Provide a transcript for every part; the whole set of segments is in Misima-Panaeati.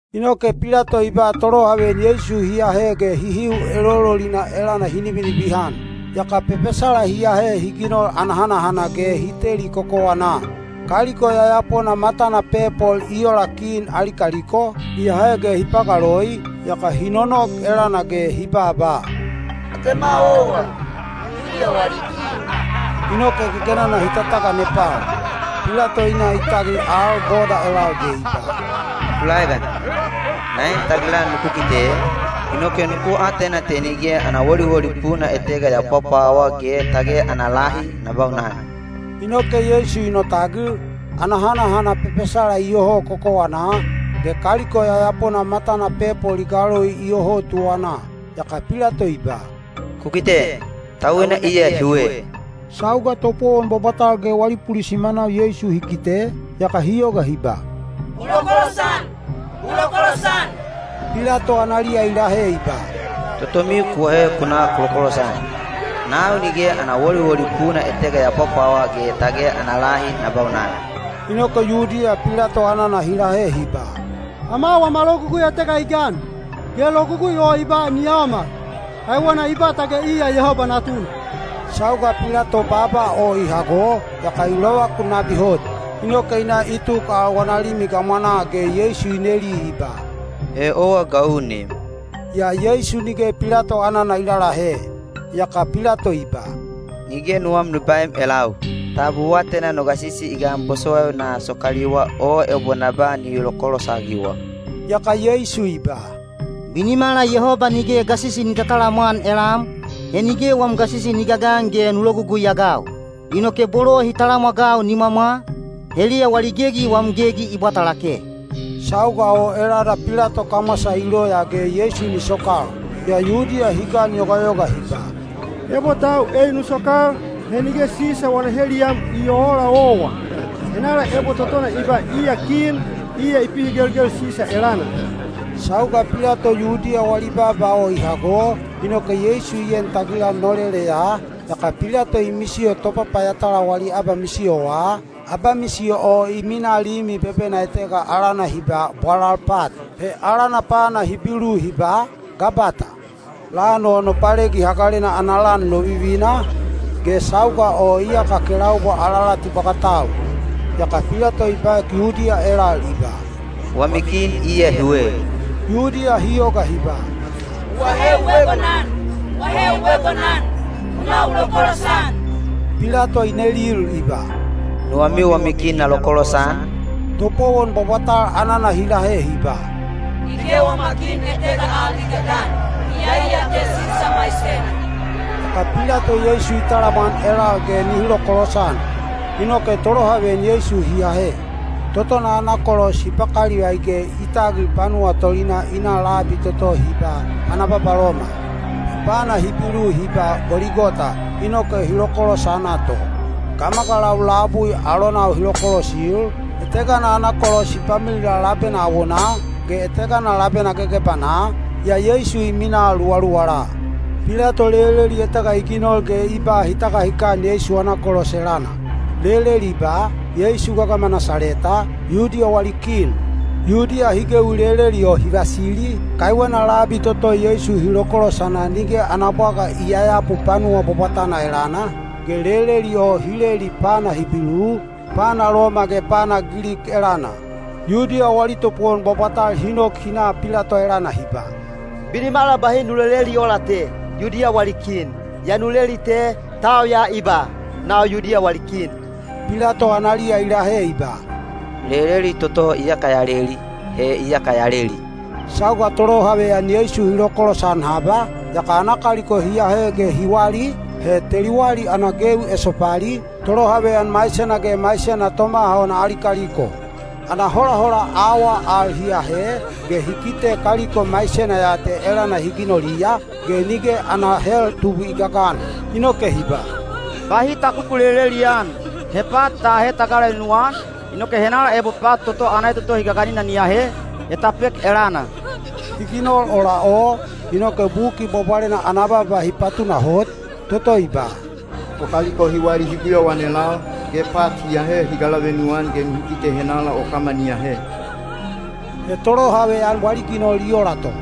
Inoke Pilato i ba tolohaveyan Yeisu hi ahe ge hihiu elololina elana hi nibinibihan. Yaka pepesala hi ahe hi ginol ana hanahana ge hi teli kokowanaa. Kaliko yayapona matana pepol i ola kin ali kaliko, hi ahe ge hi pagaloi, yaka hi nonok elana ge hi babaa, “Atema owa, Yudiya wali kin!” Inoke gegenana hi tataganepal. Pilato i na i tagil al boda elal ge i ba, “Ku laegan! Na en tagilan nuku kite, inoke nuku atena te nige ana woliwoli puna etega ya pwapwawa ge tage ana lahi na baunan.” Inoke Yeisu i notagil, ana hanahana pepesala iyoho kokowanaa, ge kaliko yayapona matana pepol i galoi iyoho tuwanaa. Yaka Pilato i ba, “Ku kite! Tauina iya hiwe!” Sauga topowon bwabwatal ge wali pulisimanau Yeisu hi kite, yaka hi yoga hi ba, “U lokolosan! U lokolosan!” Pilato analiya i lahe i ba, “Totomiu ku ahe ku na ku lokolosan. Nau nige ana woliwoli puna etega ya pwapwawa ge tage ana lahi na baunan.” Inoke Yudiya Pilato anana hi lahe hi ba, “Ama wama logugui etega i gan, ge logugui o i ba ni yaomal, kaiwena i ba tage iya Yehoba Natuna.” Sauga Pilato baaba o i hago, yaka i lovakun nabi hot. Inoke i na i tuk al wana limi gamwanaa ge Yeisu i neli i ba, “He owa ga u neem?” Yaa Yeisu nige Pilato anana i lalahe. Yaka Pilato i ba, “Nige nuwam nu baem elau? Tab u atena no gasisi i gan bosowaiu na sokaliwa o ebo na ba nihi lokolosagiwa?” Yaka Yeisu i ba, “Binimala Yehoba nige gasisi ni tatalamwan elam, he nige wam gasisi ni gagan ge nu lologugui-agau. Inoke bolo hi talamwagau nimwamwa, heliya wali gegi wam gegi i bwata lake.” Sauga o elana Pilato kamwasa i loya ge Yeisu ni sokal. Yaa Yudiya hi ganyogayoga hi ba, “Ebo tau ei nu sokal, he nige Sisa wana heliyam i oola owa. Henala ebo totona i ba iya kin, iya i pihigelgel Sisa elana.” Sauga Pilato Yudiya wali baaba o i hago, inoke Yeisu i en tagilan noleleya, yaka Pilato i misiyo topapayatala wali abamisiyowa, abamisiyo o i minaa limi bebena etega alana hi ba, “Bwalal Pat.” He alana pana Hibilu hi ba, “Gabata.” Lan o Nopalegi Hagalena ana lan lovivina, ge sauga o iyaka kelaubwa alalati bwagatau. Yaka Pilato i baek Yudiya elal i ba, “Wami kin iya hiwe.” Yudiya hi yoga hi ba, “U ahe u egonan! U ahe u egonan! U na u lokolosan!” Pilato i nelil i ba, “Nuwamiu wami kin na lokolosan?” Topowon bwabwatal anana hi lahe hi ba, “Nige wama kin etega al i gagan, iyai ya te Sisa maisena.” Yaka Pilato Yeisu i talamwan elal ge nihi lokolosan. Inoke tolohaveyan Yeisu hi ahe. Totona ana kolos hi pakalivai ge i tagil panuwa tolinaa i na labi toto hi ba “Pana Babaloma.” (He pana Hibilu hi ba “Goligota.”) Inoke hi lokolosana to. Gamagalau labui alonau hi lokolosil, etegana ana kolos hi pamilila labena awonaa, ge etegana labena gegebanaa, yaa Yeisu i minaa luwaluwala. Pilato leleli etega i ginol ge i ba hi tagahikan Yeisu ana kolos elana. Leleli i ba, “Yeisu gagama Nasaleta, Yudiya wali kin.” Yudiya hi gewi leleli o hi vasili, kaiwena labi toto Yeisu hi lokolosana nige ana bwaga i yayapu panuwa bwabwatana elana, ge leleli o hi leli pana Hibilu, pana Loma ge pana Gilik elana. Yudiya wali topowon bwabwatal hi nok hi na Pilato elana hi ba, “Binimala bahi nu leleli ola te, ‘Yudiya wali kin.’ Yaa nu leli te, ‘Tau ya i ba: Nau Yudiya wali kin.’” Pilato analiya i lahe i ba, “Leleli toto iyaka ya leli, he iyaka ya leli.” Sauga tolohaveyan Yeisu hi lokolosan haba, yaka ana kaliko hi ahe ge hi wali, he teli wali ana gewi esopali, tolohaveyan maisena ge maisena tomaha ona ali kaliko. Ana holahola awaa al hi ahe, ge hi kite kaliko maisena ya te elana hi ginoliya, ge nige ana hel tubwi i gagan. Inoke hi ba, “Bahi ta kukuleleli-an. He pat ta ahe ta galavenu-an, inoke henala ebo pat toto ana etotohi gaganina ni ahe, he ta pek elana.” Hi ginol ola o, inoke Buki Bwabwalena ana baaba hi patunahot, toto i ba: “O kaliko hi wali hi guyauan elal, ge pat hi galavenu-an yaka nihi kite henala o kama ni ahe.” He tolohaveyan wali ginol i ola to.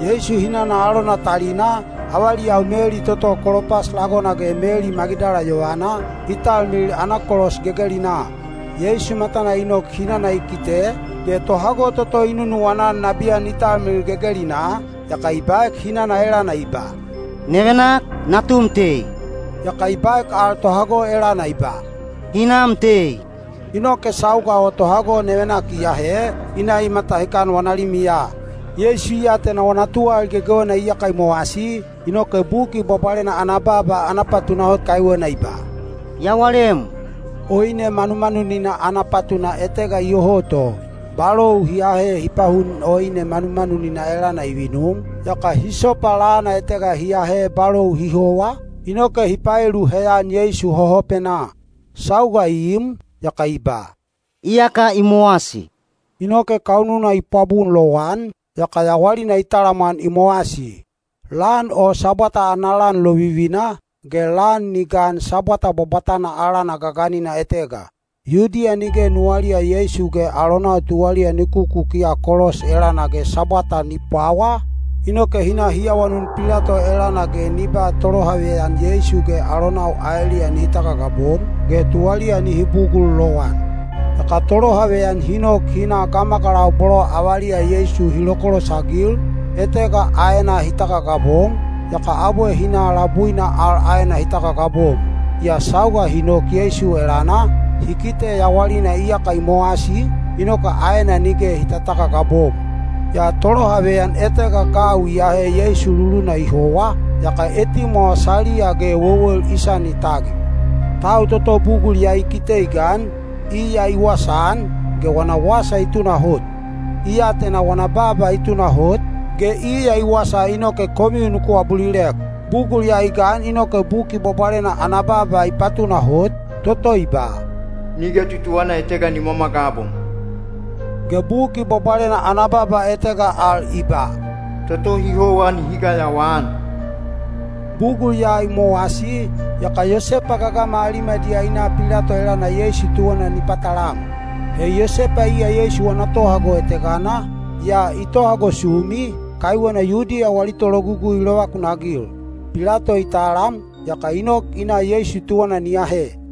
Yeisu hinana alona talina, avaliyau Meli toto Kolopas lagona ge Meli Magidala yovana, hi talmilil ana kolos gegelinaa. Yeisu matana i nok hinana i kite, ge tohago toto i nunuwana-an nabiyan i talmilil gegelinaa, yaka i baek hinana elana i ba, “Nevenak, natum tei.” Yaka i baek al tohago elana i ba, “Hinam tei.” Inoke sauga o tohago nevenak i ahe, i na i matahikan wana limiya. Yeisu i atena wana tuwalali gegewena iyaka i mowasi, inoke Buki Bwabwalena ana baaba ana patunahot kaiwena i ba, “Ya walem.” Oine manumanunina ana patuna etega iyoho to. Balou hi ahe hi pahun oine manumanunina elana i vinum, yaka hisopa lana etega hi ahe balou hi howa, inoke hi paelu heyan Yeisu hohopenaa. Sauga i im, yaka i ba, “Iyaka i mowasi.” Inoke kaununa i pwabun lowan, yaka yawalina i talamwan i mowasi. Lan o Sabwata ana lan lovivina, ge lan ni gan Sabwata bwabwatana alana gaganina etega. Yudiya nige nuwaliya Yeisu ge alonau tuwaliya ni kukukiya kolos elana ge Sabwata ni pwawa, inoke hi na hi awanun Pilato elana ge ni ba tolohaveyan Yeisu ge alonau aeliya nihi tagagabom, ge tuwaliya nihi bugul lowan. Yaka tolohaveyan hi nok hi na gamagalau bolo avaliya Yeisu hi lokolosagil, etegana aena hi tagagabom, yaka abwe hi na labuina al aena hi tagagabom. Yaa sauga hi nok Yeisu elana, hi kite yawalina iyaka i mowasi, inoke aena nige hi tatagagabom. Yaa tolohaveyan etega gau i ahe Yeisu luluna i howa, yaka etimwawa saliya ge wewel i sani tagil. Tau toto bugul ya i kite i gan, iya i wasaan, ge wana wasa i tunahot. I atena wana baaba i tunahot, ge iya i wasa inoke komiu nuku abulilek. Bugul ya i gan inoke Buki Bwabwalena ana baaba i patunahot, toto i ba, “Nige tutuwana etega ni mwamwagabom.” Ge Buki Bwabwalena ana baaba etega al i ba, “Toto hi howa nihi gayawaan.” Bugul ya i mowasi, yaka Yosepa gagama Alimadiya i na Pilato elana Yeisu tuwana ni patalam. He Yosepa iya Yeisu wana tohago etegana, yaa i tohago sumi, kaiwena Yudiya wali tologugui i lovakunagil. Pilato i talam, yaka i nok i na Yeisu tuwana ni ahe.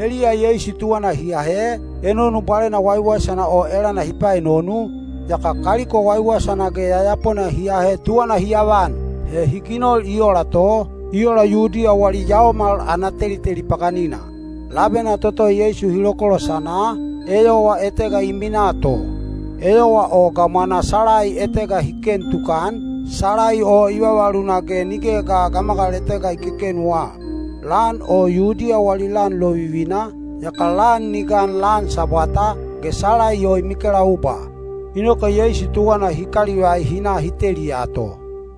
Heliya Yeisu tuwana hi ahe, enonu bwalena waiwaisana o elana hi paenonu, yaka kaliko waiwaisana ge yayapona hi ahe tuwana hi avan. He hi ginol i ola to, i ola Yudiya wali yaomal ana teliteli paganina. Labena toto Yeisu hi lokolosana, eyowa etega i minaa to. Eyowa o gamwanaa salai etega hi ken tukan, salai o i vavaluna ge nigeya ga gamagal etega i kekenuwa. Lan o Yudiya wali lan lovivina, yaka lan ni gan lan Sabwata, ge salai o i mikelaubwa. Inoke Yeisu tuwana hi kalivai hi na hi teliya to.